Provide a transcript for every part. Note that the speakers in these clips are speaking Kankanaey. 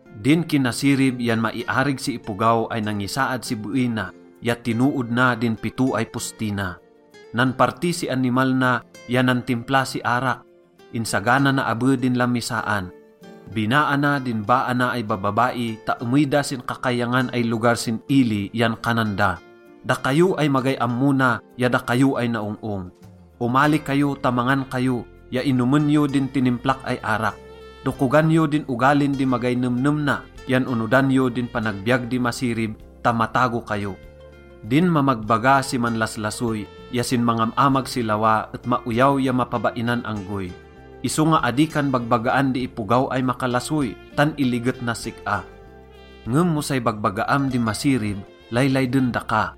Din kinasirib yan maiarig si ipogaw ay nangisaad si beey na ya tinood na din pito ay posti na. Nanparti si animal na ya nantimpla si arak. Insagana na abe din lamisaan. Binaa na din baa na ay babbabai ta emey da sin kakayangan ay lugar sin ili yan kanan da: “Dakayo ay magay ammo na ya dakayo ay naong-ong, omali kayo ta mangan kayo ya inomen yo din tinimplak ay arak. Dokogan yo din ogalin di magay nemnem na yan onodan yo din panagbiyag di masirib ta matago kayo.” Din mamagbaga si manlaslasoy ya sin mangam-amag si lawa et maoyaw ya mapabainan anggoy. Isonga adi kan bagbagaan di ipogaw ay makalasoy, tan iliget nas sik-a. Ngem mo say bagbagaam di masirib, laylayden daka.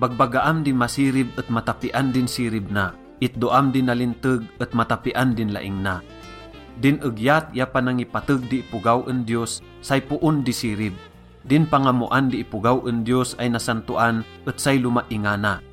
Bagbagaam di masirib et matapian din sirib na. Itdoam di nalinteg et matapian din laing na. Din egyat ya panangipateg di ipogaw en Diyos, say poon di sirib. Din pangammoan di ipogaw en Diyos ay nasantoan et say lomaingana.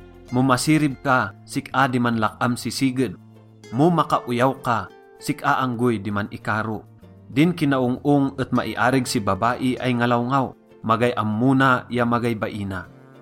Mo masirib ka, sik-a di manlak-am si siged. Mo makaoyaw ka, sik-a anggoy di man-ikaro. Din kinaong-ong et maiarig si babai ay ngalawngaw, magay ammo na ya magay baina.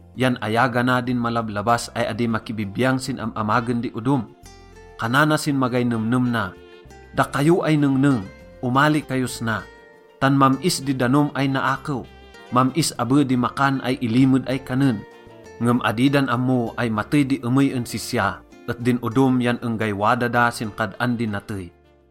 yan ayagana din malablabas ay adi makibibiyang sin am-amagen di odom. Kanana sin magay nemnem na, “Dakayo ay nengneng, omali kayos na, tan mam-is di danom ay naakew. Mam-is abe di makan ay ilimed ay kanen.” Ngem adi dan ammo ay matey di emey en sisya et din odom yan enggay wada da sin kad-an di natey.